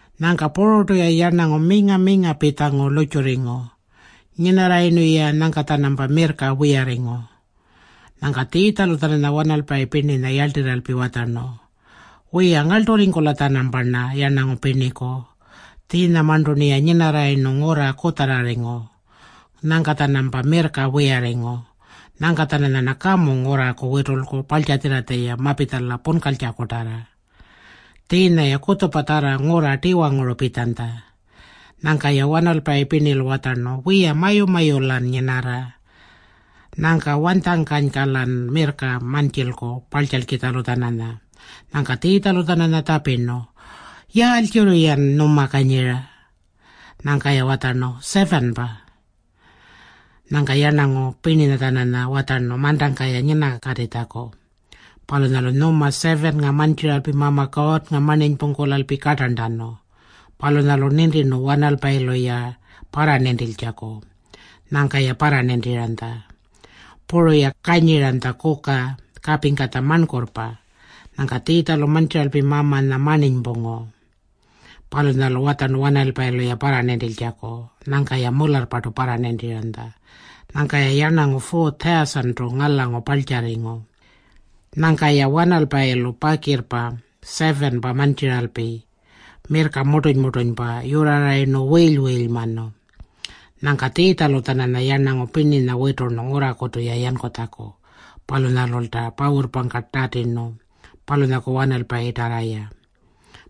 Nyangka pururtu-ya yarnangu minga-minga pitjangu lurrtjurringu. Nyinarrayirnu-ya, nyangka-tjanampa mirrka wiyarringu. Nyangka Tjiitjalu-tjananya wanalpayi pirninya yarltirralpi watjarnu, “Wiya, ngarlturringkula-tjanamparna yarnangu pirniku. Tjiinyamarntu-rniya nyinarrayirnu ngurra kutjarrarringu. Nyangka-tjanampa mirrka wiyarringu. Nyangka-tjananyarna kamu ngurraku witulku parltjatjirratja-ya mapitjala punkaltjakutarra. Tjiinya-ya kutjupatjarra ngurra tiwanguru pitjanytja.” Nyangka-ya wanalpayi pirnilu watjarnu, “Wiya, mayu-mayu-lan nyinarra. Nyangka wanytjangkanyka-lan mirrka mantjilku parltjalkitjalu-tjananya?” Nyangka Tjiitjalu-tjananya tjapirnu, “Yaaltjirri-yan nyuma kanyira?” Nyangka-ya watjarnu, “7-pa.” Nyangka yarnangu pirninya-tjananya watjarnu mantangka-ya nyinakatitjaku. Palunyalu nyuma 7-nga mantjiralpi Mama Kuurrnga marninypungkulalpi kartarntanu. Palunyalu nintirnu wanalpayilu-ya parranintiltjaku. Nyangka-ya parranintiranytja. Puru-ya kanyiranytja kuka kapingkatja marnkurrpa. Nyangka Tjiitjalu mantjiralpi Mamanya marninypungu. Palunyalu watjarnu wanalpayilu-ya parranintiltjaku. Nyangka-ya mularrpartu parranintiranytja. Nyangka-ya yarnangu 4,000-tu ngalangu parltjarringu. Nyangka-ya wanalpayilu pakirrpa 7-pa mantjiralpi mirrka murtuny-murtunypa yurrarayirnu wiily-wiilymanu. Nyangka Tjiitjalu-tjananya yarnangu pirninya witurnu ngurrakutu-ya yankutjaku. Palunyalulta pawurrpangka tatirnu palunyaku wanalpayinyatarra-ya.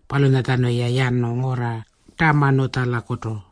Palunyatjanu-ya yanu ngurra Tamanutjalakutu.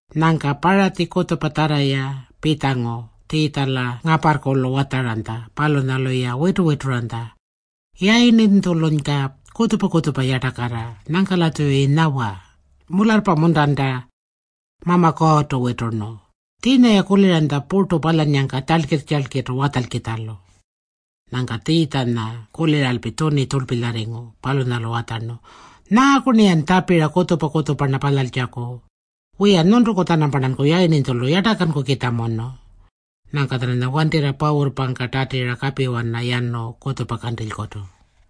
Nyangka Paratji kutjupatjarra-ya pitjangu Tjiitjala ngaparrkulu watjaranytja. Palunyalu-ya witu-wituranytja, “Yayirninytjulunyka kutjupa-kutjupa yartakarra. Nyangka-latjuyi nyawa, ‘Mularrpa-muntanta Mama Kuurrtu witurnu?’” Tjiinya-ya kuliranytja purtu palyannyangka tjalkirr-tjalkirrtu watjalkitjalu. Nyangka Tjiitjanya kuliralpi tjuni tjurlpilyarringu. Palunyalu watjarnu, “Nyaaku-rniyan tjapira kutjupa-kutjupa-rna palyaltjaku? Wiya, nyuntuku-tjanamparnanku yayirninytjulu yartakankukitjamunu.” Nyangka-tjananya wantirra pawurrpangka tatira kapiwana yanu kutjupa kantilykutu.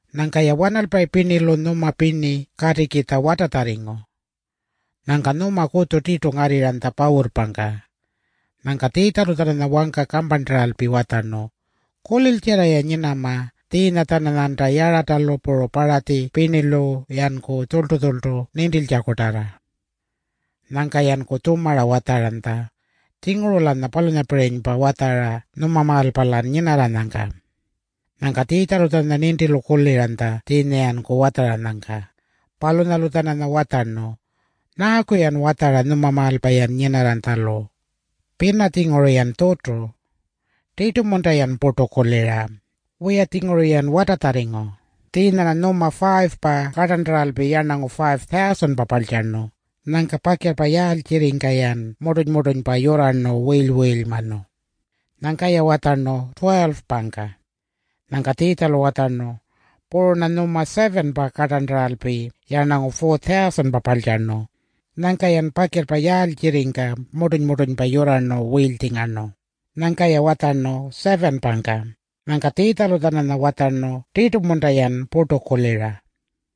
Nyangka-ya wanalpayi pirnilu nyuma pirni katikitja watatjarringu. Nyangka nyuma kutju tirtu ngarrirranytja pawurrpangka. Nyangka Tjiitjalu-tjananya wangka kamparntaralpi watjarnu, “Kuliltjarra-ya nyinama tjiinya-tjananyanta Yaratalu puru Paratji pirnilu-yanku tjurltu-tjurltu nintiltjakutarra.” Nyangka-yanku tjumara watjaranytja, “Tjinguru-lanya palunyapirinypa watjara nyumamaalpa-lan nyinarranyangka.” Nyangka Tjiitjalu-tjananya nintilu kuliranytja tjiinya-yanku watjaranyangka. Palunyalu-tjananya watjarnu, “Nyaaku-yan watjara nyumamaalpa-yan nyinarranytjalu? Pina-tjinguru-yan tjutu. Tirtu-munta-yan purtu kulira? Wiya-tjinguru-yan watatjarringu. Tjiinya-rna nyuma 5-pa kartarntaralpi yarnangu 5,000-pa parltjarnu. Nyangka pakirrpa yaaltjirringka-yan murtuny-murtunypa yurrarnu wiily-wiilymanu?” Nyangka-ya watjarnu, “12-pangka.” Nyangka Tjiitjalu watjarnu, “Puru-rna nyuma 7-pa kartarntaralpi yarnangu 4,000-pa parltjarnu. Nyangka-yan pakirrpa yaaltjirringka murtuny-murtunypa yurrarnu wiilytjingarnu?” Nyangka-ya watjarnu, “7-pangka.” Nyangka Tjiitjalu-tjananya watjarnu, “Tirtu-munta-yan purtu kulira?”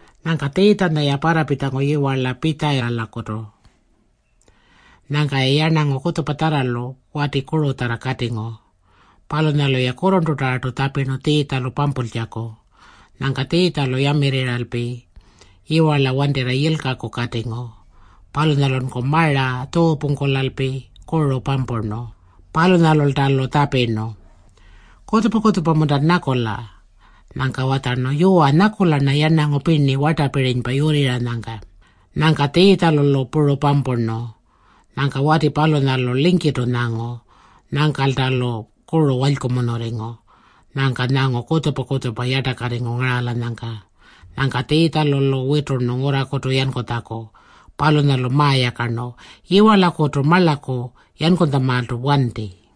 Nyangka Tjiitjanya-ya parrapitjangu yiwarla Pitjayitalakutu. Nyangka-ya yarnangu kutjupatjarralu wati kurutjarra katingu. Palunyalu-ya kurrurntutarra tjapirnu Tjiitjalu-lu pampultjaku. Nyangka Tjiitjalu yamirriralpi yiwarla wantirra yilkaku katingu. Palunyalunku mara tjuupungkulalpi kuru pampurnu. Palunyalulta-lu tjapirnu, “Kutjupa-kutjupa-muntan nyakula?” Nyangka watjarnu, “Yuwa, nyakula-rna yarnangu pirni wartapirinypa yurrirranyangka.” Nyangka Tjiitjalu-lu puru pampurnu. Nyangka wati palunyalu lingkirrtu nyangu. Nyangkalta-lu kuru walykumunurringu. Nyangka nyangu kutjupa-kutjupa yartakarringu ngaralanyangka. Nyangka Tjiitjalu-lu witurnu ngurrakutu yankutjaku. Palunyalu mayakarnu, “Yiwarlakutu marlaku yankutjamaaltu wanti.”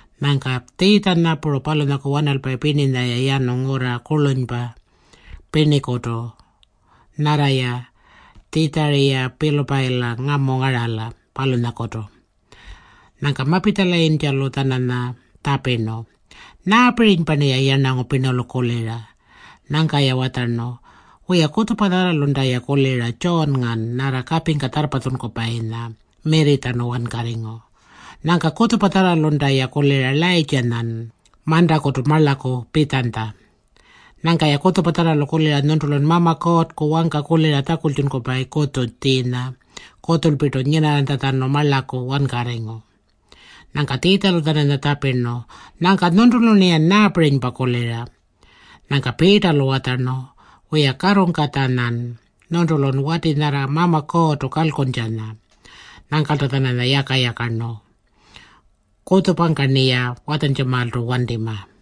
Nyangka Tjiitjanya puru palunyaku wanalpayi pirninya-ya yanu ngurra kurlunypa pirnikutu nyarra-ya Tjitjariya-Pilupayila ngamu ngarala, palunyalakutu. Nyangka mapitjalayintjalu-tjananya tjapirnu, “Nyaapirinypa-rniya yarnangu pirnilu kulira?” Nyangka-ya watjarnu, “Wiya, kutjupatjarralunta-ya kulira Tjuunngan nyarra kapingka tjarrpatjunkupayinya mirritjanu wankarringu. Nyangka kutjupatjarralunta-ya kulira Layirrtjanyan mantakutu marlaku pitjanytja. Nyangka-ya kutjupatjarralu kulira nyuntulun Mama Kuurrku wangka kulira tjakultjunkupayi kutju tjiinya kutjulpirtu nyinarranytjatjanu marlaku wankarringu.” Nyangka Tjiitjalu-tjananya tjapirnu, “Nyangka nyuntulu-rniyan nyaapirinypa kulira?” Nyangka Piitalu watjarnu, “Wiya, Katungkatjanyan. Nyuntulun wati nyarra Mama Kuurrtu kalkuntjanya.” Nyangkalta-tjananya yaka-yakarnu, “Kutjupangka-rniya watjantjamaaltu wantima.”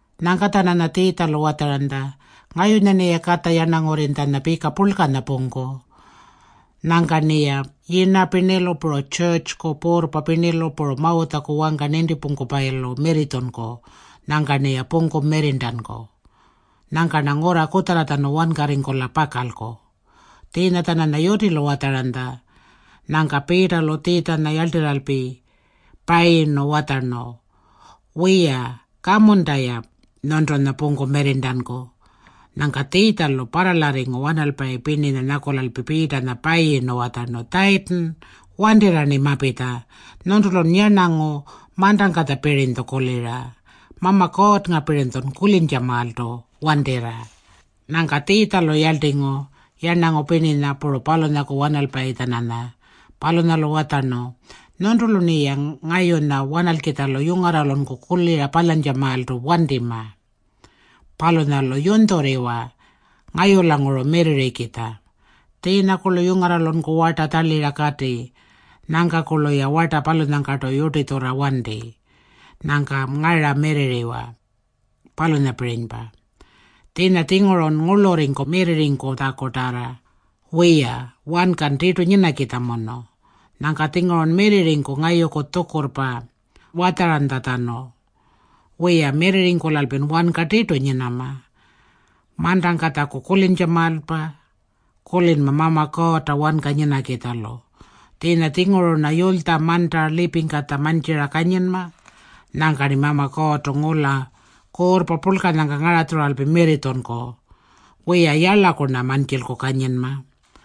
Nyangka-tjananya Tjiitjalu watjaranytja, “Ngayunya-rniya Katja Yarnangurrinytjanya pika purlkanya pungku. Nyangka-rniya yirna pirnilu puru tjurrtjuku puurrpa pirnilu puru Mawutjaku wangka nintipungkupayilu mirritjunku. Nyangka-rniya pungku mirrirntanku. Nyangka-rna ngurra kutjarratjanu wankarringkula pakalku.” Tjiinya-tjananya yutilu watjaranytja. Nyangka Piitalu Tjiitjanya yarltirralpi payirnu watjarnu, “Wiya, kamunta-ya nyuntunya pungku mirrirntanku.” Nyangka Tjiitjalu parralarringu wanalpayi pirninya nyakulalpi Piitanya payirnu watjarnu, “Tjayitin, wantirra-rni mapitja. Nyuntulun yarnangu mantangkatjapirinytju kulira. Mama Kuurrngapirinytjun kulintjamaaltu wantirra.” Nyangka Tjiitjalu yarltingu yarnangu pirninya puru palunyaku wanalpayi-tjananya. Palunyalu watjarnu, “Nyuntulu-rniya ngayunya wanalkitjalu yungarralunku kulira palyantjamaaltu wantima. Palunyalu yunytjurriwa ngayulanguru mirrirrikitja. Tjiinyakurlu yungarralunku warta tjarlira kati. Nyangkakurlu-ya warta palunyangkartu yurtitjurra wanti. Nyangka ngara mirrirriwa, palunyapirinypa. Tjiinya-tjingurun ngurlurringku mirrirritjakutarra. Wiya, wankan tirtu nyinakitjamunu. Nyangka-tjingurun mirrirringku ngayuku tjukurrpa watjaranytjatjanu. Wiya, mirrirringkulalpin wanka tirtu nyinama. Mantangkatjaku kulintjamaalpa, kulinma Mama Kuurrta wanka nyinakitjalu. Tjiinya-tjinguru-rna yulytja manta lipingkatja mantjira kanyinma. Nyangka-rni Mama Kuurrtu ngula kuurrpa purlkanyangka ngaratjuralpi mirritjunku. Wiya, yarlaku-rna mantjilku kanyinma.